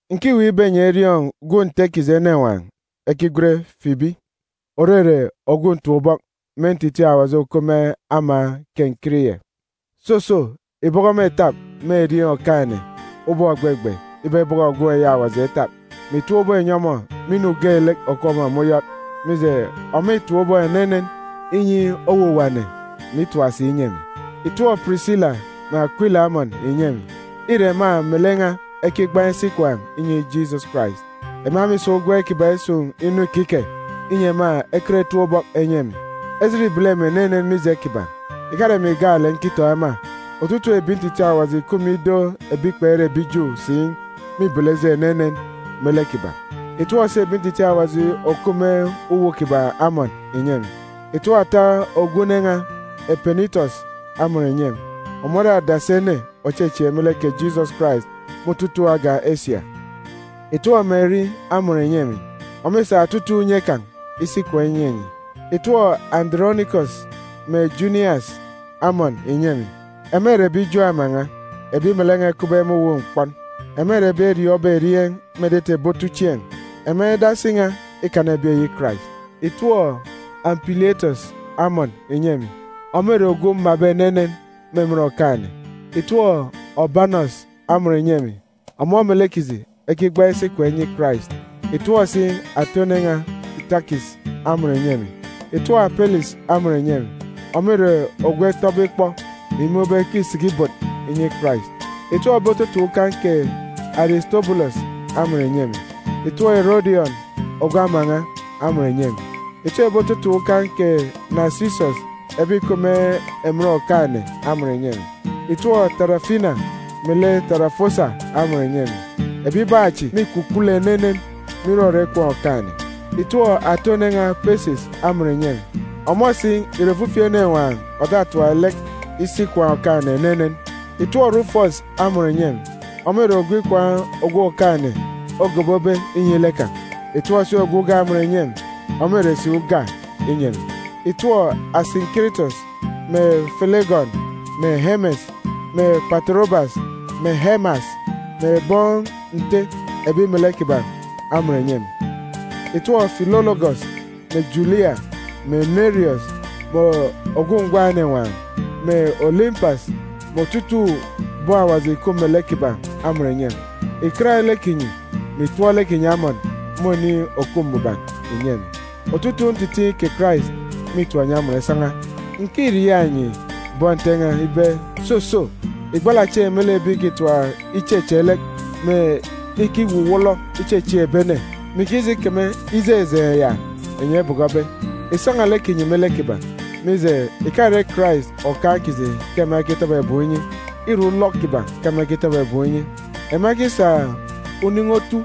Ǹkiweek ibe enyi eriọọn̄ gwun̄ Nte kiji enenwaan̄ ekigwen Fibi, òrere ogwu ntap-ubọk me ntitiin̄ Awaji òkup me ama Kenkiriye. Soso, ìbọkọ ọmọ ìtap me erieen̄ Okaan̄-ene ubọk ògbegbe ibe ebọkọ gwun̄ eyi Awaji etap, mè ìtap ubọk ìnyi ọmọ me inu geelek òkup ọmọ me uyọt. Mije, ọmọ îtap ubọk enenen inyi owuwa ene, mè itap si inyi emi. Ìtọp Pirisila mè Akwila amọn ìnyi emi. Îre ema melek n̄a ekigbaan̄ isi ikwaan̄ inyi Jisọs Karais. Ema mîsa ugwem kiban̄ isun̄ inu ikike, inyi ema ekọt etap ubọk enyi emi. Ejit îbele emi enenen mije kiban̄. Ìkare emi gaalek nkitọn̄ ema, otutuuk ebi ntitiin̄ Awaji ìkup me ido ebi kpere ebi Ju si mîbele ejit enenen me lek kiban̄. Ìtọp si ebi ntitiin̄ Awaji eyi òkup me uwu kiban̄ amọn ìnyi emi. Ìtọp ata ogwu une n̄a, Epenitọs, amọn ìnyi emi. Ọmọ ore adasi ene òchechieek me lek kè Jisọs Karais me otutuuk agan̄ Esia. Ìtọp Meri amọn ìnyi emi. Ọmọ îsa otutuuk unye kan̄ isi ikwaan̄ inyi enyi. Ìtọp Andọrọnikọs mè Junias amọn ìnyi emi. Ema ìre ebi Ju ama n̄a, ebi melek n̄a ekupbe me uwu mkpọn. Ema ìre ebi eriọọn̄be erieen̄ me etete ebi otuchieen̄. Ema edasi n̄a ikana ebi eyi Karais. Ìtọp Ampilietọs amọn ìnyi emi. Ọmọ ìre ogwu mmabe enenen me emen Okaan̄-ene. Ìtọp Ọbanọs amọn ìnyi emi. Ọmọ melek kiji ekigbaan̄ isi ikwaan̄ inyi Karais. Ìtọp si ata une n̄a Sitakis amọn ìnyi emi. Ìtọp Apelis amọn ìnyi emi. Ọmọ ìre ogwu eroon̄be ikpọ, mè imun̄ ibe ke îsiki ibot inyi Karais. Ìtọp ebi ototun̄ ukan̄ kè Arisitobulọs amọn ìnyi emi. Ìtọp Erọdiọn, ogwu ama n̄a, amọn ìnyi emi. Ìtọp ebi ototun̄ ukan̄ kè Nasisọs ebi ìkup me emen Okaan̄-ene amọn ìnyi emi. Ìtọp Tarafina melek Tarafosa amọn ìnyi emi. Ebibaan̄ chi mîkwukwulu enenen me irọrọ ikwaan̄ Okaan̄-ene. Ìtọp ata une n̄a Pesis amọn ìnyi emi. Ọmọ si ìre ofifi enenwaan̄ òtatap lek isi ikwaan̄ Okaan̄-ene enenen. Ìtọp Rufọs amọn ìnyi emi. Ọmọ ìre ogwu ikwaan̄ ogwu Okaan̄-ene ogobobe inyi lek kan̄. Ìtọp si ogwu uga amọn ìnyi emi. Ọmọ îre si uga inyi emi. Ìtọp Asinkiritọs, mè Felegọn, mè Emes, mè Patorobas, mè Emas, mè bọn Nte ebi melek kiban̄ amọn ìnyi emi. Ìtọp Filologọs, mè Julia, mè Neriọs, mè ogwu ngwan̄ enenwaan̄, mè Olimpas, mè otutuuk bọn Awaji ìkup melek kiban̄ amọn ìnyi emi. Ìkat lek kinyi, mè ìtọp lek kinyi amọn me oniin̄ òkup mbuban ìnyi emi. Otutuuk ntitiin̄ kè Karais mîtọp enyi amọn isan̄a. Ǹkiriaak enyi, bọn Nte n̄a ibe, soso ìgbala chieen̄ me lek ebi ìkitap icheche lek, mè ikiwuwọlọ ichechieek ebi ene, mè ikije ikeme ijejeen̄ ya enyi ebọkọbe. Ìsan̄a lek kinyi me lek kiban̄. Mije, ìkare Karais Okaan̄ kiji ke ema ekitọbọ ebum inyi. Îre ulọk kiban̄ ke ema ekitọbọ ebum inyi. Ema ekisa unin̄i otu,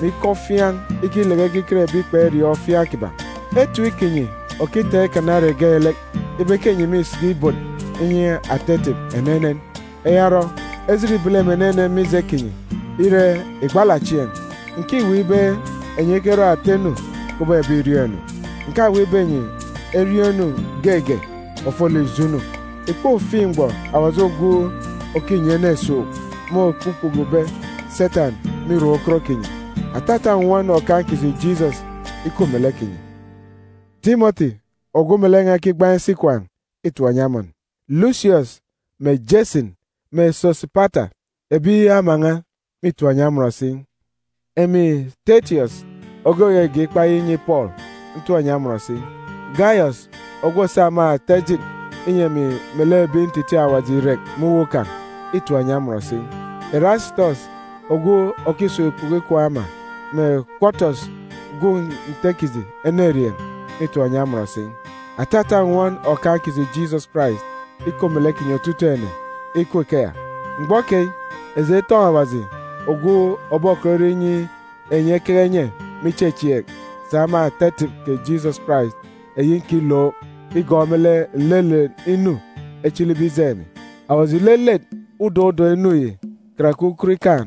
mè ikọ ofiaan̄ ikileke ekiket ebi kperiọọn̄ ofiaan̄ kiban̄. Etip kinyi òkitaan̄ ikana ere geelek ibe ke enyi mîsiki ibot inyi ata etip enenen. Eya orọ, ejit îbele emi enenen mije kinyi. Ire, ìgbala chieen̄. Ǹkiweek ibe enyi ekerọ ata inu kubọk ebi ìriọọn̄ inu. Ǹkaweek ibe enyi eriọọn̄ inu geege ofolek ijo inu. Ìkpofiin̄ mgbọ Awaji ogwu òkinyi ene esuuk môkpukpukube Setan me irak ukot kinyi. Atata nnwọn Okaan̄ kiji Jisọs ikup melek kinyi! Timọti, ogwu melek n̄a ekigbaan̄ isi ikwaan̄, îtọp enyi amọn. Lusiọs, mè Jasin, mè Sosipata, ebi ama n̄a, mîtọp enyi amọn si. Emi Tetiọs ogwu ògege ikpa yi inyi Pọọlu, ntọp enyi amọn si. Gayọs, ogwu òsa me ata ejit inyi emi melek ebi ntitiin̄ Awaji irek me uwu kan̄, îtọp enyi amọn si. Irasitọs ogwu òkisun̄ ikpoko ikwaan̄ ama, mè Kwọtọs gwun̄ Nte kiji enerieen̄ mîtọp enyi amọn si. [Atata nnwọn Okaan̄ kiji Jisọs Karais ikup melek kinyi otutuuk ene. Ikup ikeya!] Mgbọ keyi, eji etọn̄ Awaji ogwu òbokọt irọ inyi enyi ekeke enye me ichechieek sa me ata etip kè Jisọs Karais eyi nkilook igọọk me lek nlelet inu echilibe ijeen̄ emi. Awaji ìlelet udọk udọk inu yi karake ukot ikaan̄.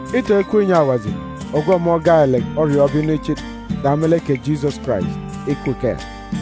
Itọn̄ ikup inyi Awaji ogwu ọmọ gaalek oriọọn̄be inu ichit, sa me lek kè Jisọs Karais! Ikup ikeya!